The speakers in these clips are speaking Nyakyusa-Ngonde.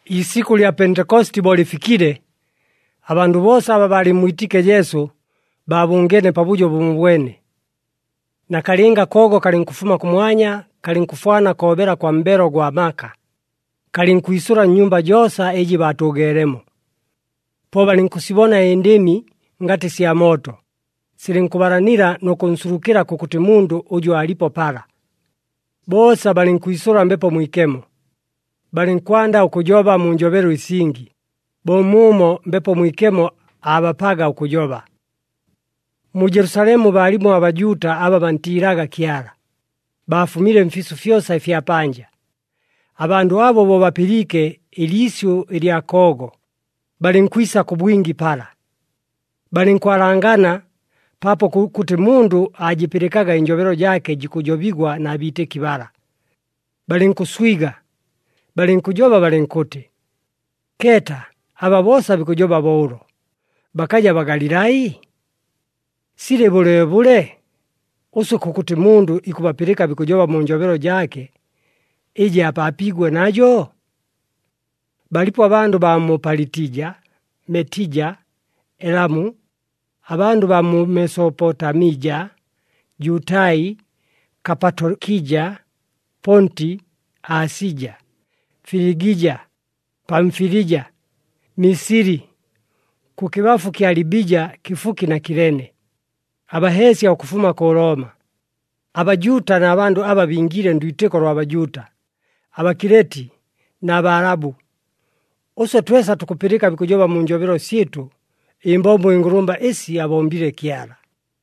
Iisikʉ lya Pentekositi bo lɨfikile, abandʉ boosa aba baalɨmmwitiike Jesu, baabʉngeene pabʉjo bʉmobwene. Nakalɨnga akoogo kalɨnkʉfuma kʉmwanya, kalɨnkʉfwana koobela kwa mbelo gwa maka, kalɨnkwisʉla nnyumba joosa ɨjɨ baatʉʉgeelemo. Po balɨnkʉsibona ɨndɨmi ngatɨ sya mooto, silɨnkʉbalanila nʉ kʉnsulukɨla kʉkʉtɨ mundʉ ʉjʉ aalipo pala. Boosa balɨnkwisʉla Mbepo Mwikemo, balɨnkwanda ʉkʉjoba mu njobelo ɨsingi, bo muumo Mbepo Mwikemo aabapaga ʉkʉjoba. Mu Jelusalemu baalimo aBajuuta aba bantiilaga Kyala, baafumile mfiisʉ fyosa ɨfya panja. Abandʉ abo bo bapɨliike ɨliisyʉ ɨlya koogo, balɨnkwisa kʉ bwingi pala. Balɨnkwalangana paapo kʉkʉtɨ mundʉ aajɨpɨlɨkaga ɨnjobelo jaake jikʉjobigwa na biitɨki bala. Balɨnkʉswiga, balɨnkʉjoba balɨnkʉtɨ, “Keeta aba boosa bikʉjoba bo ʉlo, bakaja Bagalilai? Silɨ bʉleebʉle, ʉswe kʉkʉtɨ mundʉ ikʉbapɨlɨka bikʉjoba mu njobelo jaake, ɨjɨ aapaapiigwe najo? Balipo abandʉ baa mu Palitija, Metija, Elamu, abandʉ baa mu Mesopotamija, Jutai, Kapatokija, Ponti, Asija, Filigija, Pamfilija, Misili, kʉkɨbafu kya Libija kɨfuki na Kilene, abaheesya ʉkʉfuma kʉ Looma, aBajuuta na bandʉ aba bingiile ndwitɨko lwa Bajuuta, aBakileti na Baalabu. Ʉswe twesa tukʉpɨlɨka bikʉjoba mu njobelo syɨtʉ ɨmbombo ɨngʉlʉmba ɨsi abombile Kyala!”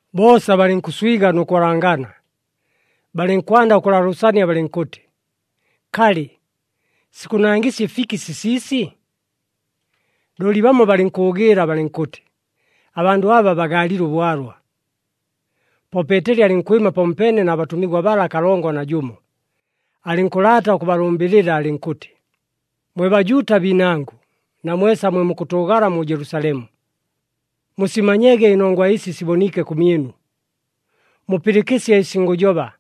Boosa balɨnkʉswiga nʉ kwalangana, balɨnkwanda ʉkʉlaalʉʉsania balɨnkʉtɨ, “Kalɨ, sikʉnangɨsya ɨfiki sisiisi?” Looli bamo balɨnkʉʉgɨɨla balɨnkʉtɨ, “Abandʉ aba bagaalile ʉbwalwa.” Po Peeteli alɨnkwɨma pamopeene na batʉmigwa bala kalongo na jʉmo, alɨnkʉlaata ʉkʉbalʉmbɨlɨla alɨnkʉtɨ, “Mwe Bajuuta biinangʉ, na mwesa mwe mukʉtʉʉgala mu Jelusalemu, musimanyege ɨnongwa ɨsi siboniike kʉmyɨnu, mupɨlɨkɨsye ɨsi ngʉjoba.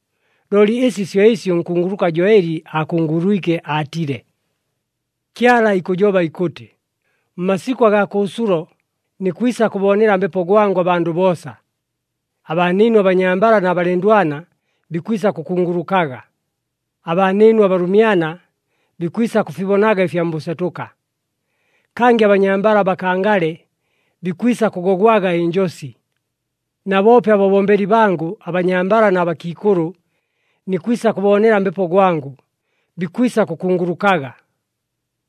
Looli ɨsi syo ɨsi ʉnkunguluka Joeli aakungulwike aatile, ‘Kyala ikʉjoba ikʉtɨ, Mmasikʉ agaa kʉʉsulo, nikwisa kʉboonela Mbepo gwangʉ abandʉ boosa. Abaanɨɨnu abanyambala na balɨndwana bikwisa kʉkungulukaga, abaanɨɨnu abalʉmyana bikwisa kʉfibonaga ɨfya mbʉsetʉka, kangɨ abanyambala abakangale bikwisa kʉgogwaga ɨnjosi. Na boope ababombeli bangʉ, abanyambala na bakiikʉlʉ, nikwisa kʉboonela Mbepo gwangʉ, bikwisa kʉkungulukaga.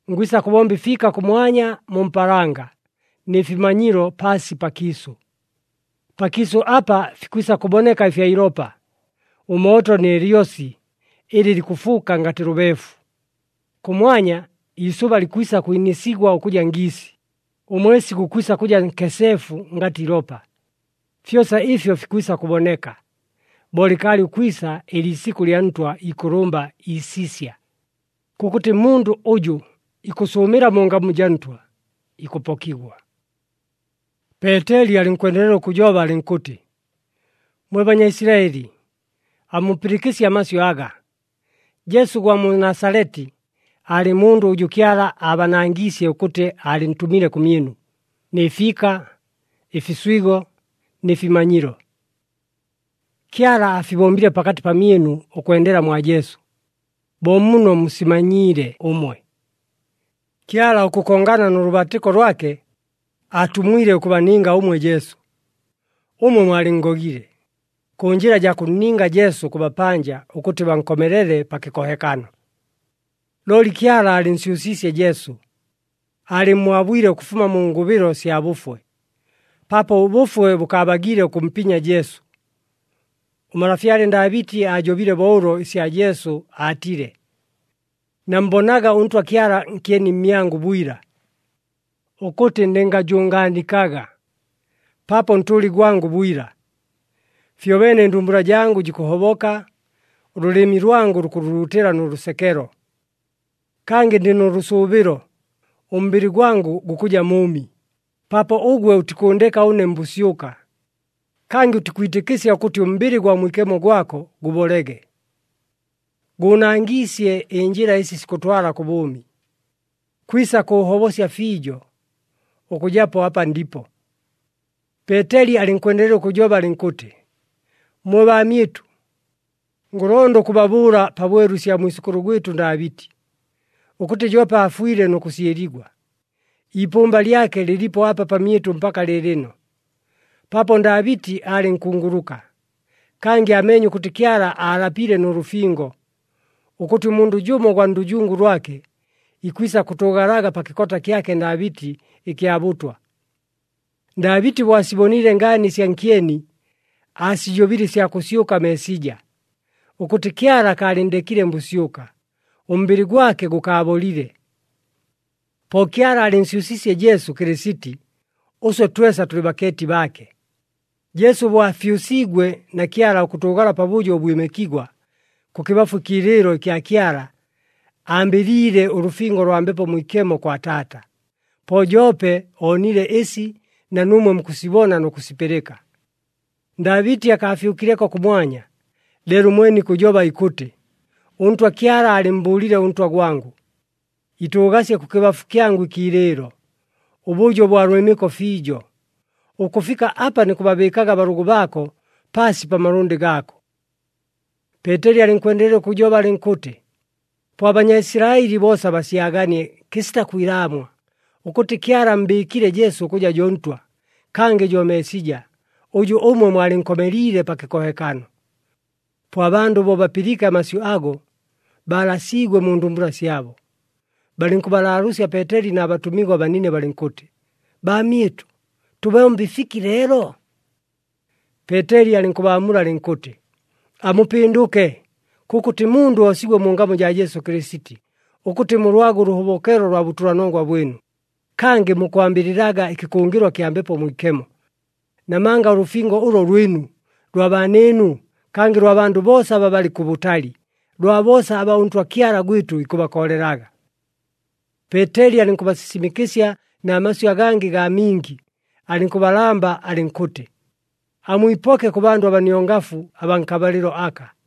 Ngwisa kʉbomba ɨfiika kʉmwanya mu mpaalanga, nɨ fimanyilo paasi pakiisʉ. Pakiisʉ apa fikwisa kʉboneka ɨfya ilopa, ʉmooto nɨ lyosi ɨlɨ likʉfuuka ngatɨ lʉbeefu. Kʉmwanya, iisʉba likwisa kwinɨsigwa ʉkʉja ngiisi, ʉmwesi gukwisa kʉja nkeseefu ngatɨ ilopa. Fyosa ɨfyo fikwisa kʉboneka, bo lɨkaalɨ ʉkwisa ɨliisikʉ lya Ntwa ikʉlʉmba iisisya. Kʉkʉtɨ mundʉ ʉjʉ ikʉsʉʉmɨla mu ngamu jaa Ntwa, ikʉpokigwa.’” Peeteli alɨnkwendelela ʉkʉjoba alɨnkʉtɨ, “Mwe Banyaisilaɨli, amupɨlɨkɨsye amasyʉ aga! Jesu ʉgwa mu Nasaleti, aalɨ mundʉ ʉjʉ Kyala aabanangiisye ʉkʉtɨ aalɨntʉmile kʉmyɨnu, nɨ fiika, ɨfiswigo nɨ fimanyilo. Kyala aafibombile pakatɨ pamyɨnu, ʉkwendela mwa Jesu, bo muno musimanyiile ʉmwe. Kyala ʉkʉkongana nʉ lʉbaatɨko lwake, aatumwile ʉkʉbaninga ʉmwe Jesu. Ʉmwe mwalɨnngogile, kʉ njɨla jaa kʉnninga Jesu kʉ bapanja ʉkʉtɨ bankomelele pa kɨkohekano. Looli Kyala aalɨnsyʉsiisye Jesu, aalɨmmwabwile ʉkʉfuma mu ngʉbɨlo sya bʉfwe, paapo ʉbʉfwe bʉkaabagiile ʉkʉmpinya Jesu. Ʉmalafyale Ndaabɨti aajobile bo ʉlo ɨsya Jesu aatile, ‘Nammbonaga ʉNtwa Kyala nkyeni mmyangʉ bwila, ʉkʉtɨ ndɨngajʉngaanikaga, paapo ntʉʉli gwangʉ bwila. Fyobeene ɨndumbula jangʉ jikʉhoboka, ʉlʉlɨmi lwangʉ lukʉluluutɨla nʉ lʉsekelo. Kangɨ ndɨ nʉ lʉsʉʉbɨlo, ʉmbɨlɨ gwangʉ gukʉja mʉʉmi, paapo ʉgwe ʉtikʉʉndeka ʉne mbʉsyʉka, kangɨ ʉtikwitɨkɨsya ʉkʉtɨ ʉmbɨlɨ gwa Mwikemo gwako gʉbolege. Gʉʉnangiisye ɨnjɨla ɨsi sikʉtwala kʉ bʉʉmi, kwisa kʉʉhobosya fiijo, ʉkʉjapo apa ndipo.’” Peeteli alɨnkwendelela ʉkʉjoba alɨnkʉtɨ, “Mwe baamyɨtʉ, ngʉlonda ʉkʉbabʉʉla pabwelu ɨsya mwisʉkʉlʉ gwɨtʉ Ndaabɨti, ʉkʉtɨ joope aafwile nʉ kʉsyɨligwa. Iipʉmba lyake lɨlipo apa pamyɨtʉ mpaka lɨɨlɨno. Paapo Ndaabɨti aalɨ nkunguluka, kangɨ aameenye ʉkʉtɨ Kyala aalapile nʉ lʉfingo, ʉkʉtɨ ʉmundʉ jʉmo ʉgwa ndʉjungu lwake, ikwisa kʉtʉʉgalaga pa kɨkota kyake Ndaabɨti ɨkya bʉtwa. Ndaabɨti bo asiboniile ngaani ɨsya nkyeni, aasijobile ɨsya kʉsyʉka Meesija, ʉkʉtɨ Kyala akaalɨnndekile mbʉsyʉka, ʉmbɨlɨ gwake gʉkaabolile. Po Kyala aalɨnsyʉsiisye Jesu Kɨlɨsiti, ʉswe twesa tʉlɨ bakeeti baake. Jesu bo afyʉsiigwe na Kyala ʉkʉtʉʉgala pabʉjo ʉbwɨmɨkigwa, kʉkɨbafu ɨkiilɨɨlo ɨkya Kyala, ambɨliile ʉlʉfingo lwa Mbepo Mwikemo kwa Taata, po joope oonile ɨsi na nuumwe mukʉsibona nʉ kʉsipɨlɨka. “Ndaabɨti akaafyʉkileko kʉmwanya, leelo ʉmwene ikʉjoba ikʉtɨ, ‘ɄNtwa Kyala aalɨmmbʉʉlile ʉNtwa gwangʉ, “Itʉʉgasye kʉkɨbafu kyangʉ ɨkiilɨɨlo, ʉbʉjo ʉbwa lwɨmɨko fiijo, ʉkʉfika apa nikʉbabɨɨkaga abalʉgʉ baako paasi pa malʉndɨ gaako.”’” Peeteli alɨnkwendelela ʉkʉjoba alɨnkʉtɨ, “Po aBanyaisilaɨli boosa basyaganie kɨsita kwilaamwa ʉkʉtɨ Kyala ammbɨɨkile Jesu ʉkʉja jo Ntwa, kangɨ jo Meesija, ʉjʉ ʉmwe mwalɨnkomeliile pa kɨkohekano.” Po abandʉ bo bapɨliike amasyʉ ago, baalasiigwe mu ndumbula syabo. Balɨnkʉbalaalʉʉsya Peeteli na batʉmigwa banine balɨnkʉtɨ, “Baamyɨtʉ, tʉbombe ɨfiki leelo?” Peeteli alɨnkʉbaamula alɨnkʉtɨ, “Amupɨndʉke, kʉkʉtɨ mundʉ oosigwe mu ngamu jaa Jesu Kɨlɨsiti, ʉkʉtɨ mulwage ʉlʉhobokelo lwa bʉtʉlanongwa bwɨnu, kangɨ mukwambɨlɨlaga ɨkɨkʉngɨlwa kya Mbepo Mwikemo. Namanga ʉlʉfingo ʉlo lwɨnu, lwa baanɨɨnu, kangɨ lwa bandʉ boosa aba balɨ kʉbʉtali, lwa boosa aba ʉNtwa Kyala gwɨtʉ ikʉbakoolelaga.” Peeteli alɨnkʉbasisimɨkɨsya na masyʉ agangɨ gaa mingi, alɨnkʉbalamba alɨnkʉtɨ, “Amwipoke kʉ bandʉ abaniongafu abaa nkabalɨlo aka.”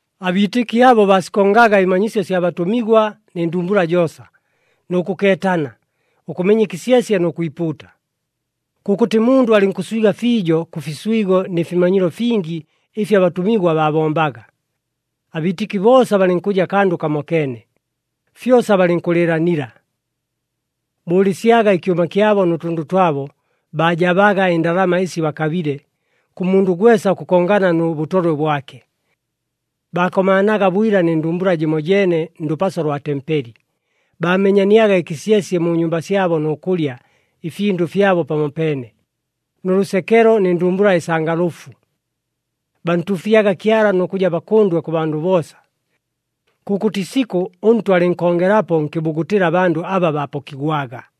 Abiitɨki abo baasikongaga ɨmanyisyo sya batʉmigwa nɨ ndumbula joosa, nʉ kʉkeetana, ʉkʉmenya ɨkɨsyesye nʉ kwipuuta. Kʉkʉtɨ mundʉ alɨnkʉswiga fiijo kʉ fiswigo ni fimanyilo fingi ɨfi abatʉmigwa baabombaga. Abiitɨki boosa balɨnkʉja kandʉ kamokeene, fyosa balɨnkʉlɨɨlanila. Bʉʉlɨsyaga ɨkyʉma kyabo nʉ tʉndʉ twabo, baajabaga ɨndalama ɨsi bakabile, kʉ mundʉ gwesa ʉkʉkongana nʉ bʉtolwe bwake. Baakomaanaga bwila nɨ ndumbula jɨmojeene ndʉpaso lwa tempeli, baamenyaniaga ɨkɨsyesye mu nyumba syabo nʉ kʉlya ɨfindʉ fyabo pamopeene, nʉ lʉsekelo nɨ ndumbula ɨsangalʉfu. Bantuufyaga Kyala nʉ kʉja bakʉndwe kʉ bandʉ boosa. Kʉkʉtɨ isikʉ ʉNtwa alɨnkongelapo nkɨbugutɨla abandʉ aba baapokigwaga.